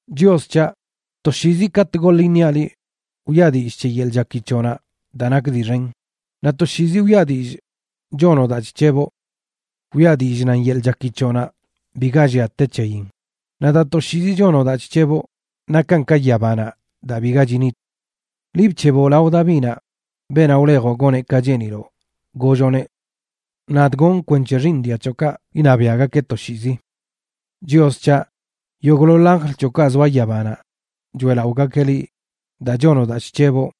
Chios c̱haꞌ, toshiizi katꞌ goḻ iṉiaꞌ liꞌ wiꞌa dillꞌ c̱he yeḻꞌ chaki c̱hoꞌnaꞌ daa nak dii xen, naꞌ toshiizi wiꞌa dillꞌ chonoꞌ daa chc̱heboꞌ. Wiꞌa dillꞌ nan yeḻꞌ chaki c̱hoꞌnaꞌ biga llia te c̱heyin; naꞌ daa toshiizi chonoꞌ daa chc̱heboꞌ, nakan ka yabanaꞌ daa biga chinit. Liꞌ bc̱heboꞌ lao Davinaꞌ, beenaꞌ wlejoꞌ goneꞌ ka cheeniloꞌ, golloꞌneꞌ: “Nadꞌ gonꞌ kwenc̱he xiiṉ dia c̱hoꞌkaꞌ iṉabiaꞌgakeꞌ toshiizi.” Chios c̱haꞌ, yogꞌḻoḻ anjl c̱hoꞌkaꞌ zoa yabanaꞌ choeꞌlaꞌogakeꞌ liꞌ daa chonoꞌ daa chc̱heboꞌ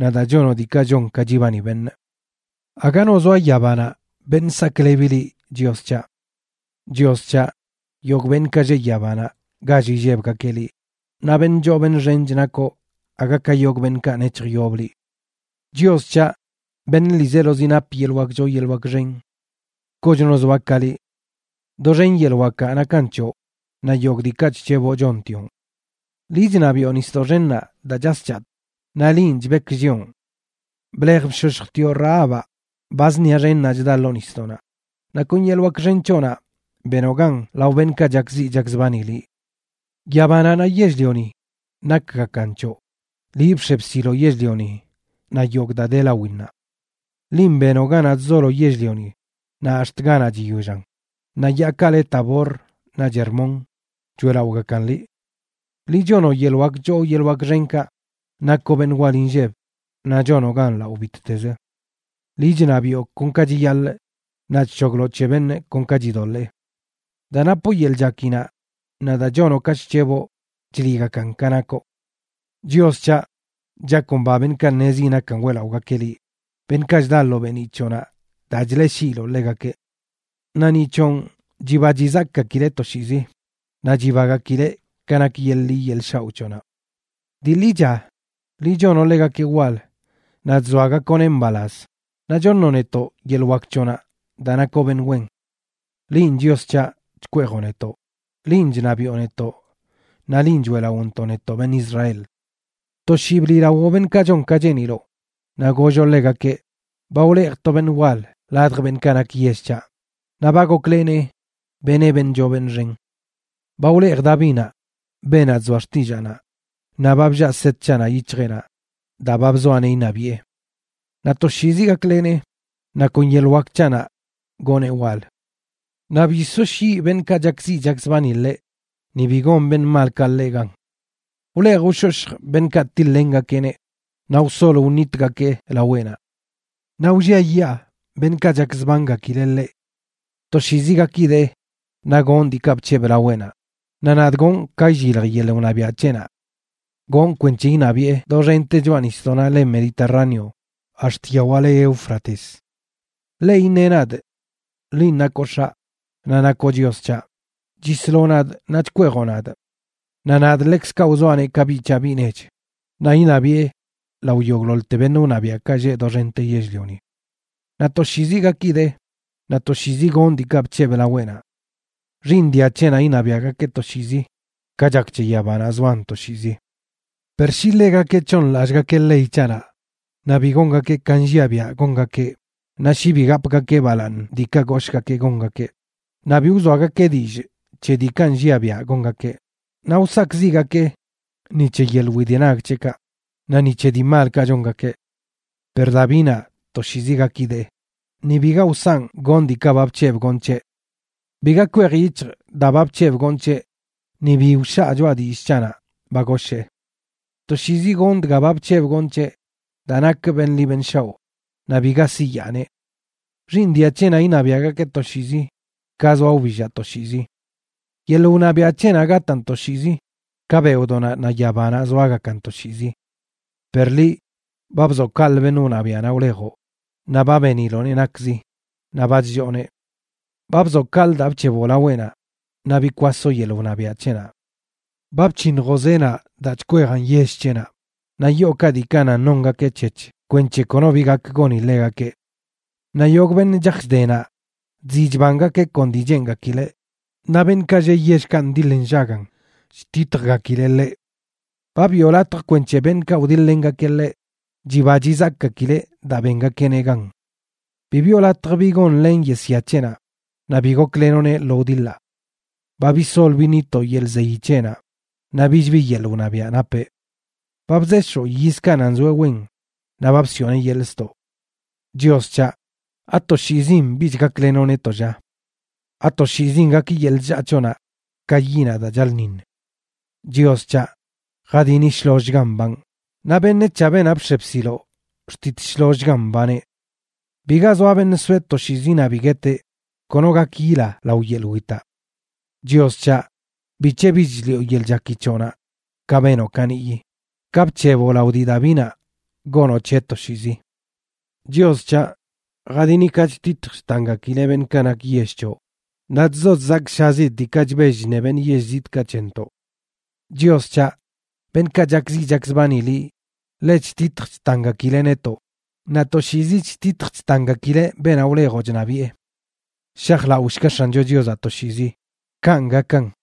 naꞌ daa chonoꞌ diikaꞌ chon ka chibani beṉꞌ. Aga no zoa yabanaꞌ beṉꞌ saklebi liꞌ, Chios c̱haꞌ. Chios c̱haꞌ, yogꞌ beṉꞌkaꞌ lleꞌ yabanaꞌ gall illebgakeꞌ liꞌ, naꞌ beṉꞌ choo beṉꞌ xench nakoꞌ aga ka yogꞌ beṉꞌkaꞌ nec̱hjyob liꞌ. Chios c̱haꞌ, beṉꞌ ḻiizelozi nap yeḻꞌ wak choo yeḻꞌ wak xen, ¡kochno zoa ka liꞌ! Doxen yeḻꞌ wakaꞌ nakan c̱hoꞌ naꞌ yogꞌ diikaꞌ chc̱heboꞌ chontioꞌn. Liꞌ chṉabiꞌo nisdoꞌ xennaꞌ daa chas chatꞌ, naꞌ linꞌ chbekllioꞌn. Blej bshoshjtioꞌ Rahabaꞌ, ba zṉia xennaꞌ chda ḻoo nisdoꞌnaꞌ; naꞌ kon yeḻꞌ wak xen c̱hoꞌnaꞌ benoꞌ gan lao beṉꞌkaꞌ chakziꞌ chakzbani liꞌ. Yabanaꞌ naꞌ yell-lioni nakgakan c̱hoꞌ; liꞌ bx̱e bsiloꞌ yell-lioni naꞌ yogꞌ daa de lawinnaꞌ. Linꞌ benoꞌ ganaꞌ chzolo yell-lioni naꞌ ax̱t ganaꞌ chiyollan; naꞌ yaakaꞌ le Tabor naꞌch Hermón choeꞌlaꞌogakan liꞌ. Liꞌ chonoꞌ yeḻꞌ wak choo yeḻꞌ wak xenkaꞌ; nakoꞌ beṉꞌ wal inlleb naꞌ chonoꞌ gan lao bittezə. Liꞌ chṉabiꞌo kon ka chiyaḻꞌ naꞌ chc̱hogloꞌ c̱he beṉꞌ kon ka chidoḻee. Daa napoꞌ yeḻꞌ chakinaꞌ naꞌ daa chonoꞌ ka chc̱heboꞌ chliꞌgakan ka nakoꞌ. Chios, c̱haꞌ, chakomba beṉꞌkaꞌ ṉezi nakan weꞌlaꞌogakeꞌ liꞌ, beṉꞌkaꞌ chda lo beeniꞌ c̱hoꞌnaꞌ daa chleꞌshiiloꞌ ḻegakeꞌ. Naꞌ ni c̱honꞌ chiba chizakꞌgakileꞌ toshiizi, naꞌ chibagakileꞌ ka nak yeḻꞌ ḻi yeḻꞌ shaoꞌ c̱hoꞌnaꞌ. Dii ḻicha, liꞌ chonoꞌ ḻegakeꞌ wal naꞌ chzoagakoꞌneꞌ mbalaz; naꞌ choṉoꞌ netoꞌ yeḻꞌ wak c̱hoꞌnaꞌ daa nakoꞌ beṉꞌ wen. ¡Linꞌ Chios c̱haꞌ, chkweejoꞌ netoꞌ! ¡Linꞌ chṉabiꞌo netoꞌ naꞌ linꞌ choeꞌlaꞌontoꞌ, netoꞌ beṉꞌ Israel! To shii bliꞌlawoꞌ beṉꞌkaꞌ chon ka cheeniloꞌ, naꞌ golloꞌ ḻegakeꞌ: “Ba wlejꞌ to beṉ wal ladj beṉꞌkaꞌ nak yell c̱haꞌ, naꞌ ba goklenee benee beṉꞌ choo beṉꞌ xen. Ba wlejꞌ Davinaꞌ, beenaꞌ chzoa xtillaanaꞌ, naꞌ ba bllaa set c̱haꞌnaꞌ yic̱hjeꞌnaꞌ daa ba bzoaꞌneꞌ iṉabiꞌe. Naꞌ toshiizi gaklenee, naꞌ kon yeḻꞌ wak c̱haꞌnaꞌ gonee wal. Naꞌ bi soshyiꞌ beṉꞌkaꞌ chakziꞌ chakzbani ḻeꞌ, ni bi gon beṉꞌ malkaꞌ ḻeꞌ gan. Wlej wshoshjꞌ beṉꞌkaꞌ tiḻ-lengakeꞌneꞌ; naꞌ wsol wṉitgakee laweꞌnaꞌ. Naꞌ wlliayaa beṉꞌkaꞌ chakzbangakileꞌ ḻeꞌ. Toshiizi gakidee naꞌ gonꞌ diikaꞌ bc̱hebꞌ laweꞌnaꞌ, naꞌ nadꞌ gonꞌ ka illilj yeḻꞌ wṉabiaꞌ c̱heꞌnaꞌ. Gonꞌ kwenc̱he iṉabiꞌe doxente choꞌa nisdoꞌnaꞌ le Mediterráneo ax̱t yawaꞌ le Éufrates. Ḻeꞌ iṉeꞌ nadꞌ: Linꞌ nakoꞌ X̱aꞌ, naꞌ nakoꞌ Chios c̱haꞌ, chisloꞌ nadꞌ naꞌ chkweejoꞌ nadꞌ. Naꞌ nadꞌ ḻekzkaꞌ wzoaꞌneꞌ ka biꞌ c̱haꞌ biꞌ nech, naꞌ iṉabiꞌe lao yogꞌḻoḻte beṉꞌ wṉabiaꞌkaꞌ lleꞌ doxente yell-lioni. Naꞌ toshiizi gakidee naꞌ toshiizi gonꞌ diikaꞌ bc̱hebꞌ laweꞌnaꞌ. Xiiṉ dia c̱heꞌnaꞌ iṉabiaꞌgakeꞌ toshiizi, ka chak c̱he yabanaꞌ zoan toshiizi. “Per shi ḻegakeꞌ c̱hooṉlallꞌgakeꞌ ley c̱haꞌnaꞌ, naꞌ bi gongakeꞌ ka nlliaꞌ biaꞌ gongakeꞌ, naꞌ shi bi gapgakeꞌ balaaṉ diikaꞌ goshgakee gongakeꞌ, naꞌ bi wzoagake dillꞌ c̱he diikaꞌ nlliaꞌ biaꞌ gongakeꞌ, naꞌ wsakꞌziꞌgakee ni c̱he yeḻꞌ widenag c̱heꞌkaꞌ, naꞌ ni c̱he dii malkaꞌ chongakeꞌ. Per Davinaꞌ toshiizi gakidee, ni biga wsanꞌ gonꞌ diikaꞌ ba bc̱hebꞌ gonꞌ c̱heꞌ. Biga kwej yic̱hjꞌ daa ba bc̱hebꞌ gonꞌ c̱heꞌ ni bi wshaa choꞌa dillꞌ c̱haꞌnaꞌ ba goshee. Toshiizi gonꞌ dga ba bc̱hebꞌ gonꞌ c̱heꞌ daa nakꞌ beṉꞌ ḻi beṉꞌ shaoꞌ, naꞌ biga siyaaneꞌ. Xiiṉ dia c̱heꞌnaꞌ iṉabiaꞌgakeꞌ toshiizi, ka zoa wbillaꞌ toshiizi. ¡Yeḻꞌ wṉabiaꞌ c̱heꞌnaꞌ gataan toshiizi, ka beoꞌdoꞌnaꞌ naꞌ yabanaꞌ zoagakan toshiizi!” Per liꞌ, ba bzoꞌ kaꞌlə beṉꞌ wṉabiaꞌnaꞌ wlejoꞌ; naꞌ ba beniloꞌneꞌ nakzi, naꞌ ba chllooneꞌ. Ba bzoꞌ kaꞌlə daa bc̱heboꞌ laweꞌnaꞌ; naꞌ bikwasoꞌ yeḻꞌ wṉabiaꞌ c̱heꞌnaꞌ. Ba bc̱hiṉjoꞌ zeenaꞌ daa chkweejan yell c̱heꞌnaꞌ, naꞌ yookaꞌ diikaꞌ nan nongakeꞌ c̱hec̱h kwenc̱he kono bi gak goni ḻegakeꞌ. Naꞌ yogꞌ beṉꞌ chaj chde naꞌ, chziꞌ chbangakeꞌ kon dii cheengakileꞌ; naꞌ beṉꞌkaꞌ lleꞌ yellkaꞌ ndiḻ nllagan chtitjgakileꞌ ḻeꞌ. Ba biꞌo latj kwenc̱he beṉꞌkaꞌ wdiḻ-lengakeꞌ ḻeꞌ chiba chizakꞌgakileꞌ daa bengakeꞌneꞌ gan. Bi biꞌo latj bi gonlen yesyanaꞌ c̱heꞌnaꞌ naꞌ bi goklenoꞌneꞌ lo wdiḻaꞌ. Ba bisol biṉitoꞌ yeḻꞌ zeyi c̱heꞌnaꞌ, naꞌ bich bi yeḻꞌ wṉabiaꞌ napeꞌ. Ba bzeshoꞌ yizkaꞌ nan zoeꞌ wen naꞌ ba bsiꞌoneꞌ yeḻꞌ ztoꞌ. Chios c̱haꞌ, ¿atoshiizin bich gaklenoꞌ netoꞌ, lla? ¿Atoshiizin gak yeḻꞌ chllaa c̱hoꞌnaꞌ ka yiꞌnaꞌ daa chaḻꞌṉiṉ? Chios c̱haꞌ, jadini shlollchgan mbanꞌ; naꞌ beṉec̱haꞌ beenaꞌ bx̱e bsiloꞌ xtit shlollchgan mbaneꞌ. ¡Biga zoa beṉꞌ soeꞌ toshiizi naꞌ bi gueteꞌ! ¡Kono gak yila lao yeḻꞌ witaꞌ! Chios c̱haꞌ, ¿bic̱he bich chliꞌo yeḻꞌ chaki c̱hoꞌnaꞌ ka benoꞌ kaniꞌyi, ka bc̱heboꞌ lao dii Davinaꞌ gonoꞌ c̱heꞌ toshiizi? Chios c̱haꞌ, jadini ka chtitj chtangakileꞌ beṉꞌkaꞌ nak yell c̱hoꞌ; naꞌ chzo chzakshazidꞌ diikaꞌ chbell chṉe beṉꞌ yell zitꞌka c̱hentoꞌ. Chios c̱haꞌ, beṉꞌkaꞌ chakziꞌ chakzbani liꞌ ḻe chtitj chtangakileꞌ netoꞌ, naꞌ toshiizi chtitj chtangakileꞌ beenaꞌ wlejoꞌ chṉabiꞌe. Shajlaoshga X̱ancho Chiozaꞌ toshiizi. ¡Kanꞌ gakan!